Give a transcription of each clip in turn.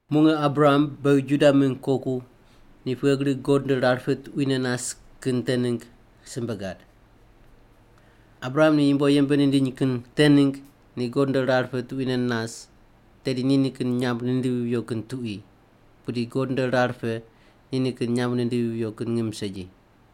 Muq nge Abraham beghi Juda mingg koku ni pughe gri God nde rar pe tuquine nas kin te ningg simbe gad. Abraham ni yumbo yembe nindiny kin te ningg ni God nde rar pe tuquine nas, tedi ni nikin nyamb nindivi viyo kin tuqui, pudi God nde rar pe ni nikin nyamb nindivi viyo kin ngim segi.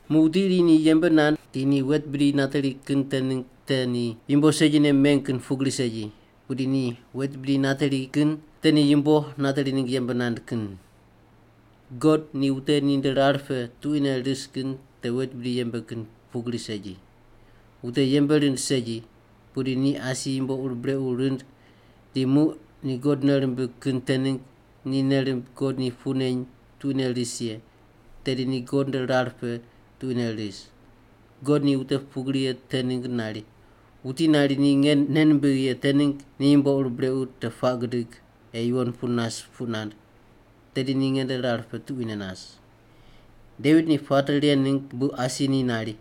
Muq wuti iri ni yembe nand di ni wet bidi nateri kin te ni yumbo segine meng kin pugri segi, pudi ni wet bidi nateri kin te ni yumbo nateri ningg yembe nand kin. God ni wute ni nde rar pe tuquine ris kin te wet bidi yembe kin pugri segi. Wute yembe rind segi. Pudi ni asi yumbo ur brequ rind, di muq ni God nei rimbig kin te ningg ni nei rimb God ni puq neny tuquine ris ye, tedi ni God nde rar pe tuquine ris. God ni wute pugri ye te ningg nari, “Wuti nari ni nge nei nimbigh ye te ningg ni yumbo ur brequ te puaq gidig ei yuwon pu nas puq nand, tedi ni nge nde rar pe tuquine nas.” Devit ni puate ren kin ningg bu asi ni nari,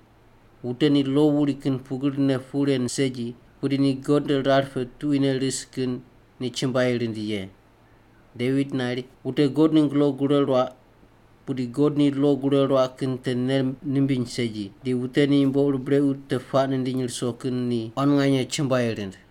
wute ni lo wuri kin pugrine puq ren segi pudi ni God nde rar pe tuquine ris kin ni chumbuai rind ye. Devit nari: “Wute God ningg lo gure ruaq, pudi God ni lo gure ruaq kin te nei nimbiny segi, di wute ni yumbo ur brequ te puaq nindiny ruso kin ni quan nganye chumbuai rind!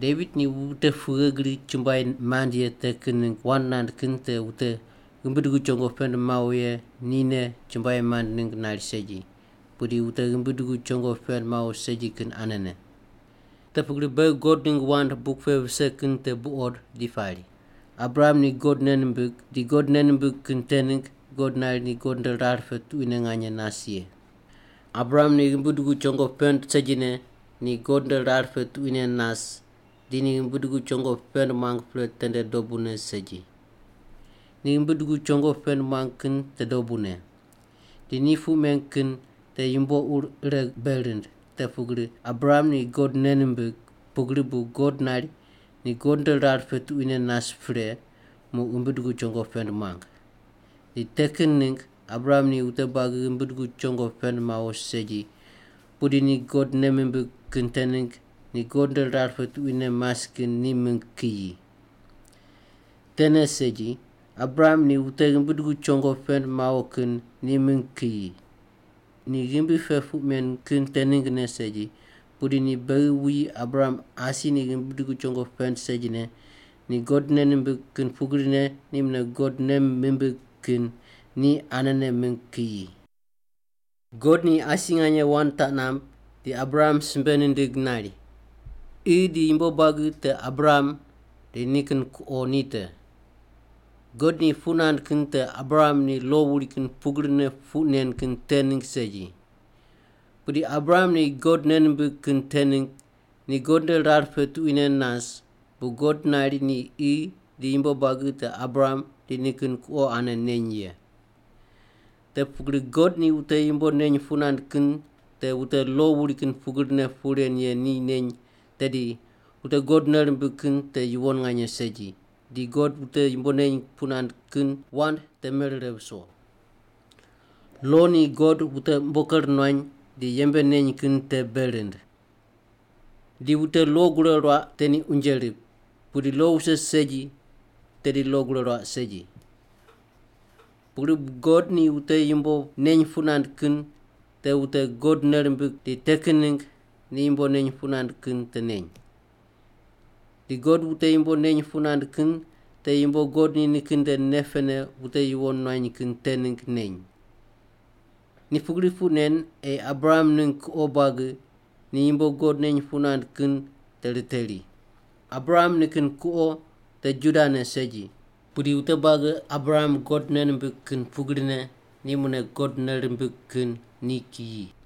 Devit ni wute pughe gri chumbuai mand ye te kin ningg wand nand kin te wute ghimbi dugu chongo pend mawo ye nine chumbuai mand ningg nari segi, pudi wute ghimbi dugu chongo pend mawo segi kin anene. Te pugri beghi God ningg wand buk pe vise kin te buqod di pari, “Abraham ni God nei nimbig di God nei nimbig kin te ningg God nari ni God nde rar pe tuquine nganye nas ye.” Abraham ni ghimbi dugu chongo pend segine ni God nde rar pe tuquine nas di ni ghimbi dugu chongo pend muang pre tende dobune segi. Ni ghimbi dugu chongo pend muang kin te dobune. Di ni puq meng kin te yumbo ur ire bei rind, te pugri Abraham ni God nei nimbig, pugri bu God nari ni God nde rar pe tuquine nas pre muq ghimbi dugu chongo pend muang. Di te kin ningg Abraham ni wute buagi ghimbi dugu chongo pend mawo segi, pudi ni God nei mimbig kin te ningg ni God nde rar pe tuquine mas kin ni mingg kiyi. Tene segi, Abraham ni wute ghimbi dugu chongo pend mawo kin ni mingg kiyi. Ni ghimbi pe puq men kin te ninggne segi, pudi ni beghi wuyi Abraham asi ni ghimbi dugu chongo pend segine ni God nei nimbig kin pugrine ni mune God nei mimbig kin ni anene mingg kiyi. God ni asi nganye wand taq namb di Abraham simbe nindig nari, qi di yumbo buagi te Abraham di nikin kuqo ni te. God ni puq nand kin te Abraham ni lo wuri kin pugrine puq nen kin te ningg segi. Pudi Abraham ni God nei nimbig kin te ningg ni God nde rar pe tuquine nas bu God nari ni qi di yumbo buagi te Abraham di nikin kuqo ane neny ye. Te pugri God ni wute yumbo neny puq nand kin te wute lo wuri kin pugrine puq ren ye ni neny, tedi wute God nei rimbig kin te yuwon nganye segi, di God wute yumbo neny puq nand kin wand te merire viso. Lo ni God wute umbo ker nuany di yembe neny kin te bei rind. Di wute lo gure ruaq te ni unje rip, pudi lo wuse segi tedi lo gure ruaq segi. Pugri bu God ni wute yumbo neny puq nand kin te wute God nei rimbig di te kin ningg ni yumbo neny puq nand kin te neny. Di God wute yumbo neny puq nand kin te yumbo God ni nikin nde nei pene wute yuwon nuany kin te ningg neny. Ni pugri puq nen ei Abraham ningg kuqo buagi ni yumbo God neny puq nand kin te riteri. Abraham nikin kuqo te Juda ne segi, pudi wute buagi Abraham God nei nimbig kin pugrine ni mune God nei rimbig kin ni kiyi.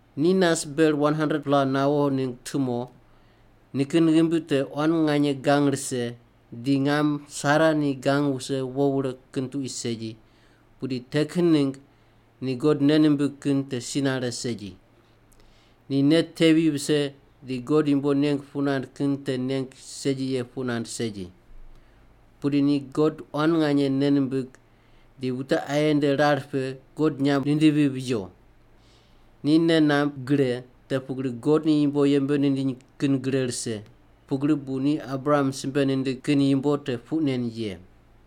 Ni nas ber 100-pela nawo ningg tumo, nikin ghimbi te quan nganye gang rise, di ngam Sara ni gang wuse wo wure kin tuqui segi, pudi te kin ningg ni God nei nimbig kin te si nare segi. Ni nei tevi vise di God yumbo neng puq nand kin te neng segi ye puq nand segi. Pudi ni God quan nganye nei nimbig di wute aye nde rar pe God nyamb rindivi viyo. Ni nei namb gre, te pugri God ni yumbo yembe nindiny kin gre rise, pugri bu ni Abraham simbe nindig kin yumbo te puq nen ye.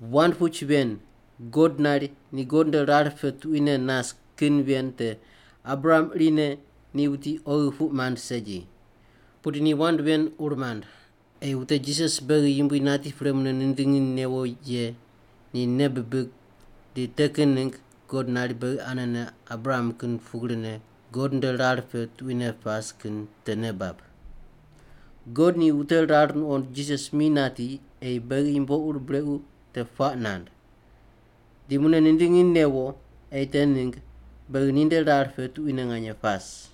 Wand puch ven, “God nari ni God nde rar pe tuquine nas” kin ven te Abraham irine ni wuti oghi puq mand segi. Pudi ni wand ven ur mand, ei wuti Jisas beghi Yumbui nati pre mune nindingi newo ye ni nei bibig, di te kin ningg God nari beghi anene Abraham kin pugrine God nde rar pe tuquine pas kin te nei bab. God ni wute rar nuqond Jisas mi nati ei beghi yumbo ur brequ te puaq nand. Di mune nindingi newo ei te ningg beghi ninde rar pe tuquine nganye pas.